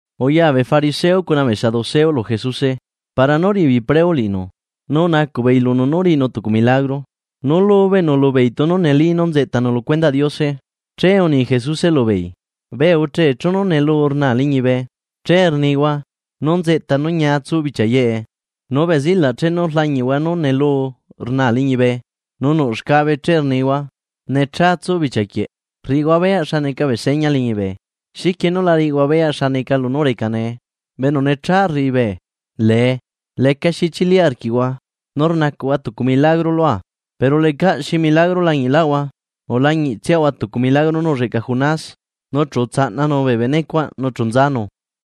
Uya bee fariseo cuna bee saduceo lu Jesuse para nú riꞌi beei preo liꞌinu. Nu unacuꞌ beei lunu nú riꞌinu tucu milagro nú lubeꞌnu lubeei tunu neli nú nzeꞌtanu lu cuendaꞌ Diose. Che uni Jesuse lubeei: ―Bee uche chenu neluu rnaa liñibe, che rnihua: “Nú nzeꞌta nú ñia tsu bichia yeꞌe.” Nu bee zilaꞌ chenu rlañiꞌhua nú neluu rnaa liñibe nu nuꞌ xcabe che rnihua: “Necha tsu bichia quieꞌ, rriꞌihua beyaꞌ xa neca bee seña liñibe.” ¿Xiquie nú la riꞌihua beyaꞌ xa neca lunú reca nee? Bee enu necha rriꞌi bee lee lecaxi chili arquiꞌhua nu rnacuꞌhua tucu milagro lua, pero lecaꞌ xi milagro lañiꞌlaꞌhua ulañiꞌtsiahua tucu milagro nú ulleꞌca Jonás. Nu chu utsaꞌnanu bee bene cuaꞌ, nu chu nzanu.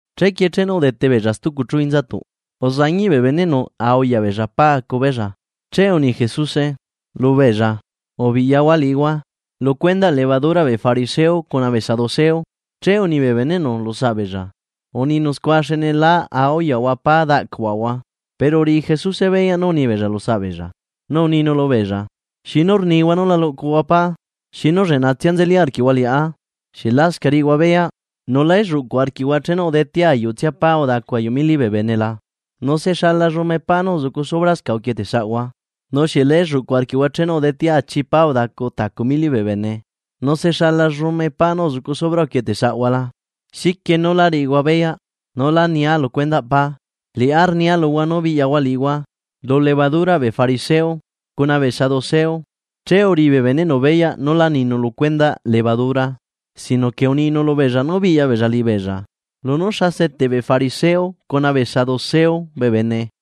Chequie chenu udete beella stucu chu inzatuꞌ, uzañiꞌ bee beneꞌnu a uyaꞌ beella pa acu beella. Che uni Jesuse lubeella: ―Ubiꞌyahua liꞌihua, lu cuendaꞌ levaduraꞌ bee fariseo cuna bee saduceo. Che uni bee beneꞌnu lu saꞌbeella: ―Uninu scua xne lá auyaꞌahua pá daꞌcuaꞌahua. Pero uriꞌi Jesuse beyaꞌ nú unibeella lu saꞌbeella, nu uninu lubeella: ―¿Xinu rnihua nú la luꞌcuhua pá? ¡Xinu lleꞌnatsia nzeli arquiꞌhua liꞌá! ¿Xieꞌ lascaꞌ riꞌihua beyaꞌ, nu la elluꞌcu arquiꞌhua chenu udetea ayuꞌtsia pá udacu ayuꞌ mili bee bene la? ¿Nu se xala llume pá nú uzucu subrascaꞌ uquietesaꞌhua? ¿Nu xieꞌ leꞌca la elluꞌcu arquiꞌhua chenu udetea achi pá udacu tacu mili bee bene, nu se xala llume pá nú uzucu subra uquieteꞌsaꞌhua la? Xiquie nú lá riꞌihua beyaꞌ nú lá nia luhua lu cuendaꞌ pá, liꞌá rnia luhua nú biꞌyahua liꞌihua lu levaduraꞌ bee fariseo cuna bee saduceo. Che uriꞌi bee beneꞌnu beyaꞌ nú lá ninu lu cuendaꞌ levadura, sino que uninu lubeella nú biꞌya beella liꞌibeella lunú xa seteꞌ bee fariseo cuna bee saduceo bee bene.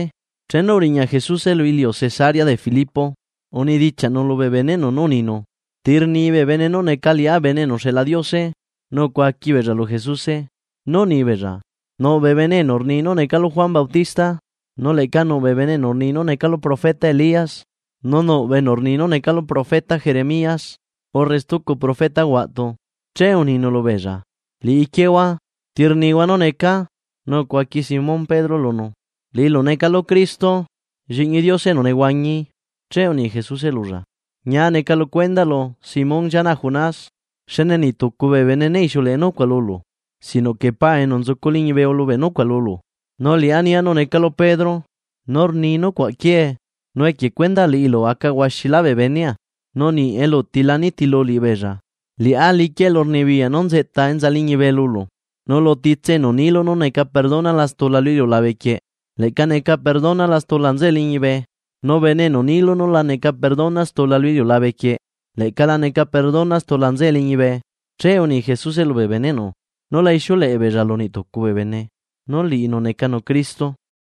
Chenu uriña Jesuse lu iliu Cesarea de Filipo, unedichiaꞌnu lubee beneꞌnu nú uninu: ―¿Ti rni bee bene nú neca Liꞌá Bene enu uxeꞌla Diose? Nu ucuaqui beella lu Jesuse, nú unibeella: ―Nuꞌ bee bene enu rni nú necalu Juan Bautista, nu leꞌca nuꞌ bee enu rni nú necalu profeta Elías, nu nuꞌ bee enu rni nú necalu profeta Jeremías, urre stucu profeta huaꞌtu. Che uninu lubeella: ―Liꞌiquiehua, ¿ti rnihua nú necaa? Nu ucuaqui Simón Pedro lunu: ―Liꞌilu necalu Cristo, Lliꞌñi Diose enu nehuañi. Che uni Jesuse lulla: ―Ñia neca lu cuendaꞌlu Simón llianaꞌ Jonás, xne niꞌ tucu bee bene ne ixiuleꞌe nucuaꞌ lulu, sino que Paa enu nzucu liñibe ulubeꞌ nucuaꞌ lulu. Nu liꞌá nia nú necalu Pedro, nu rni nucuaꞌ quiee, nu equie cuendaꞌ liꞌilu aca huaxilá bee benea nu niꞌ eluti la riꞌi ana nitilu liꞌibeella. Liꞌá liquia elurnibiyaꞌ nú nzeꞌta enza liñibe lulu, nu lu titse enu niilu nú neca perdonala stula lu iliulabe quieꞌ, leꞌca neca perdonala stula nzeꞌe liñibe, nu bene enu niilu nú la neca perdona stula lu iliulabe quieꞌ, leꞌca la neca perdona stula nzeꞌe liñibe. Che uni Jesuse lubee beneꞌnu nú la ixiuleꞌe beella lu niꞌtucu bee bene, nú liꞌinu necanu Cristo.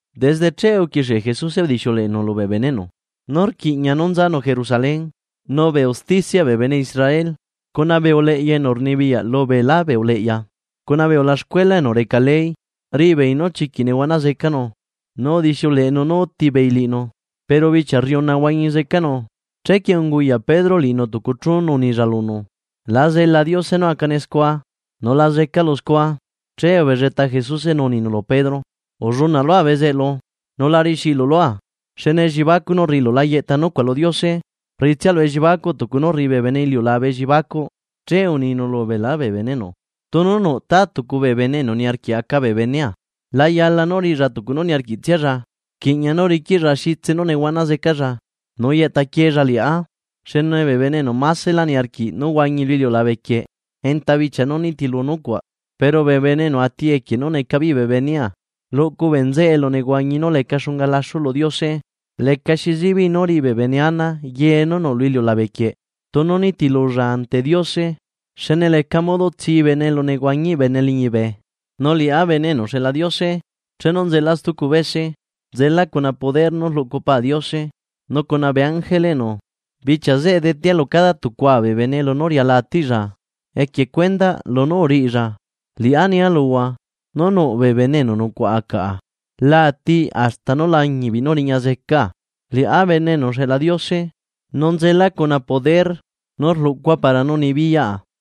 Desde che uquixie Jesuse udixiuleꞌenu lubee beneꞌnu nú rquiꞌña nú nzanu Jerusalén. Nu bee usticiaꞌ bee bene Israel cuna bee uleꞌya enu rnibiyaꞌ lubeelá bee uleꞌya cuna bee ulaxcuela enu reca ley, riꞌibeei nú chiquiꞌ nehuana zecanu. Nu udixiuleꞌenu nú utibeei liꞌinu, pero bichia rriuna huañi zecanu. Chequie unguyaꞌ Pedro liꞌinu tucu chu nu unilla lunu: ―¡La zela Diose nú acane scua! ¡Nu la zecalu scua! Che ubelleta Jesuse nu uninu lu Pedro: ―¡Ullunaꞌ lua bezeꞌlu, nu la riꞌixiꞌilu lua! Xne elliebacuꞌ nú rriꞌilu la yeꞌta nucuaꞌ lu Diose, rriꞌitsialu elliebacuꞌ tucu nú rriꞌi bee bene iliulabe elliebacuꞌ. Che uninu lubeelá bee beneꞌnu: ―Tunu nuꞌta tucu bee bene enu niarquiꞌ aca bee benea, la yala nú riꞌilla tucu nú niarquiꞌtsialla, rquiꞌña nú riquiꞌlla xitse nú nehuana zecalla nu yeꞌta quiella liꞌá. Xne bee bene enu masela niarquiꞌ nú huañi lu iliulabequieꞌ enta bichia nú nitilu nucuaꞌ, pero bee bene enu ati equie nú neca beei bee benea, luꞌcu bee nzeꞌe elunehuañi nú leca xunga laxu lu Diose. ¿Lecaxi zibiꞌ nú riꞌi bee bene ana ye nú nuꞌ lu iliulabequieꞌ, tunu nitilulla ante Diose? Xne leca modo tsibene elunehuañiꞌ bene liñibe. Nu Liꞌá Bene enu uxeꞌla Diose, chenu nzela stucu bese, nzela cuna poder nú rluꞌcu Pa Diose nu cuna bee ángeleꞌnu. Bichia zeꞌe detea lu cada tucua bee bene lunú riala atiꞌlla, equie cuendaꞌ lunú uriꞌilla. Liꞌá nia luhua, nú nuꞌ bee bene enu nucuaꞌa caꞌa lá ati hasta nú lañiꞌbeei nú riña zeca Liꞌá Bene enu uxeꞌla Diose, nzela cuna poder nú rluꞌcua para nú nibiyaꞌa.